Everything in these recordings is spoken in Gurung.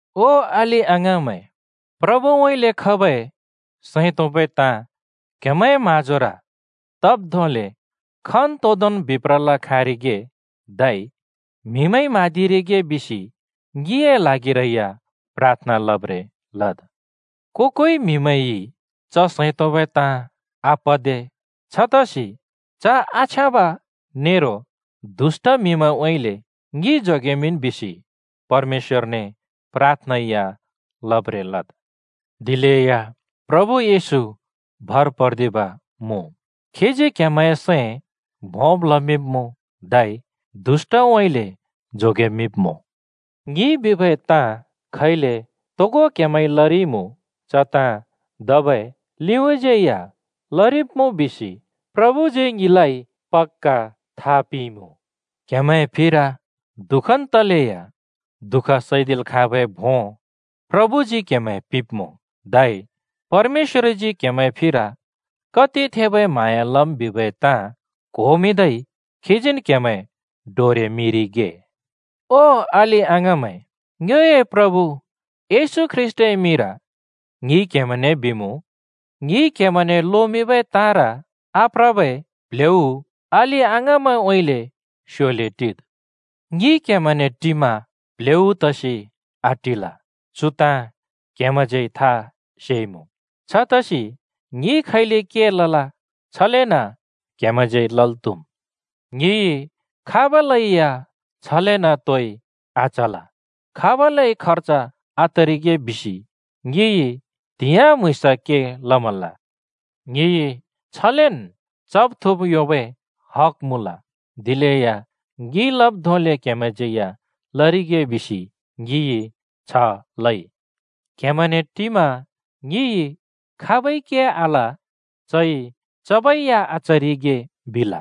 ओ अलि-अङाँमैं, प्रभुउँइँले खबै सैं तोंबै ताँ क्हेमैंए म्हाँजोर तब् धोंले खन्तोंदोंन् बिप्रल् खाँरिगे धै म्हिमैंइ म्हाँदिरिगे बिसि ङिए ल्हागिरै या प्राथना लब्रें लद्। को-कोइ म्‍हिमैंइ च सैं तोंबै ताँ आपदे। छतसि च आछ्याँब नेरो दुष्‍ट म्‍हिमैंउँइँले ङि जोगेमिंन् बिसि परमेश्‍वरने प्राथना या लब्रें लद्। दिलेया प्रभु येशू भर पर्दिब् मुँ। खीजी क्‍हेमैंए सैं भोंब् लमिंब्मुँ धै दुष्‍टउँइँले जोगेमिंब्‍मुँ। ङिइ बिबै ताँ खैले तोगो क्‍हेमैंइ लरिइमुँ, च ताँ धबै लिउँइँज्‍यै या लरिब्‍मुँ बिसि प्रभुजी ङिलाइ पक्‍का था पिंइमुँ। क्‍हेमैंए फिर दुःखन् तलेया दुःख सैदिल् खाँबै भों प्रभुजी क्हेमैं पिंब्मुँ। धै परमेश्‍वरजी क्‍हेमैंए फिर कति थबै म्हाँया लम् बिबै ताँ क्होमिंदै खीजीन् क्‍हेमैं डोरेमिंरिगे। ओ अलि-अङाँमैं, ङ्योए प्रभु येशू ख्रीष्‍टए मिंर ङिइ क्हेमैंने बिमुँ: ङिइ क्हेमैंने लोमिंबै ताँर आप्रबै प्ल्हेउ अलि-अङाँमैंउँइँले स्‍योले टिद्। ङि क्‍हेमैंने टिमा प्ह्‍लेउ तसि आटिल, चु ताँ क्‍हेमैंज्यै था सेइमुँ। छतसि ङिइ खैले के लल, छलेन क्‍हेमैंज्यै लल् त्‍हुम्। ङिइ खाबलैया छलेन् तोइ आचल, खाबलै खर्ज आतरिगे बिसि ङिइ त्‍हिंयाँ म्‍हुँइँस के लमल। ङिइ छलेन् चब् थुँब् योंबै हक मुँल, दिलेया ङिइ लब् धोंले क्‍हेमैंज्‍यै या लरिगे बिसि ङिइ छ लइ। क्‍हेमैंने टिमा ङिइ “खाबइ के आल, चइ चबै या आचरिगे” बिल।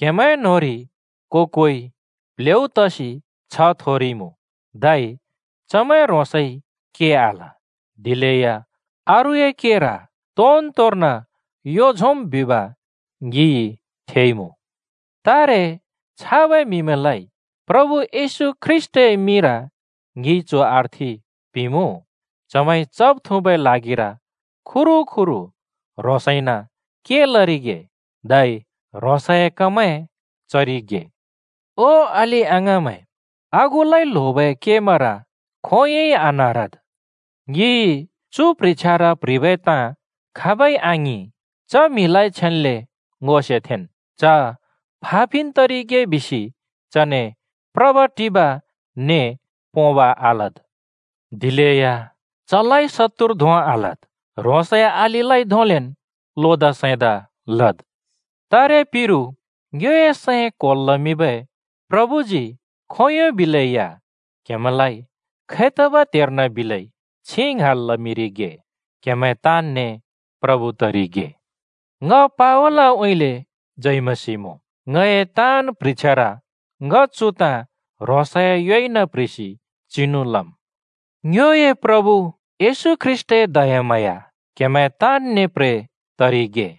क्हेमैंए न्होंरि को-कोइ प्ल्हेउ तसि छ्ह थोरिइमुँ, धै चमैं ह्रोंसइ के आल दिलेया अरूए केर तोनतोर्न यो झोंम् बिब ङिइ थेइमुँ। तारे छाबै म्हिमैंलाइ प्रभु येशू ख्रीष्‍टए मिंर ङिइ चु अर्थि पिंमुँ: चमैंइ चब-थुँबै ल्हागिर खुरूखुरू ह्रोंसैना के लरिगे धै ह्रोंसए कमैं चरिगे। ओ अलि-अङाँमैं, आगुलाइ ल्होबै केमैंर खोंयोंइ आनारद्। ङिइ चु प्ह्रिछ्यार प्‍ह्रिबै ताँ खाबै आङिं, च म्हिलाइ छेन्‍ले ङो सेथेंन्। च फा पिन् तरिगे बिसि चने प्रब-टिब ने पोंब आलद्। दिलेया चलाइ शत्तुर धों आलद्, ह्रोंसए अलिलाइ धोंलेन् लोदा सैंदा लद्। तारे पिरु ङ्योए सैं क्‍होल् लमिंबै प्रभुजी खोंयों बिलै या क्‍हेमैंलाइ खैतबै त्हेर्न बिलै छिं ङ्हाँल् लमिंरिगे। क्‍हेमैं ताँनने प्रभु तरिगे। ङ पावलउँइँले जय मसीह मुँ। ङए ताँन् प्ह्रिछ्यार ङ चु ताँ ह्रोंसए योइन प्ह्रिसि चिनु लम्। ङ्योए प्रभु येशू ख्रीष्‍टए दयाम्हाँया क्‍हेमैं ताँनने प्रे तरिगे।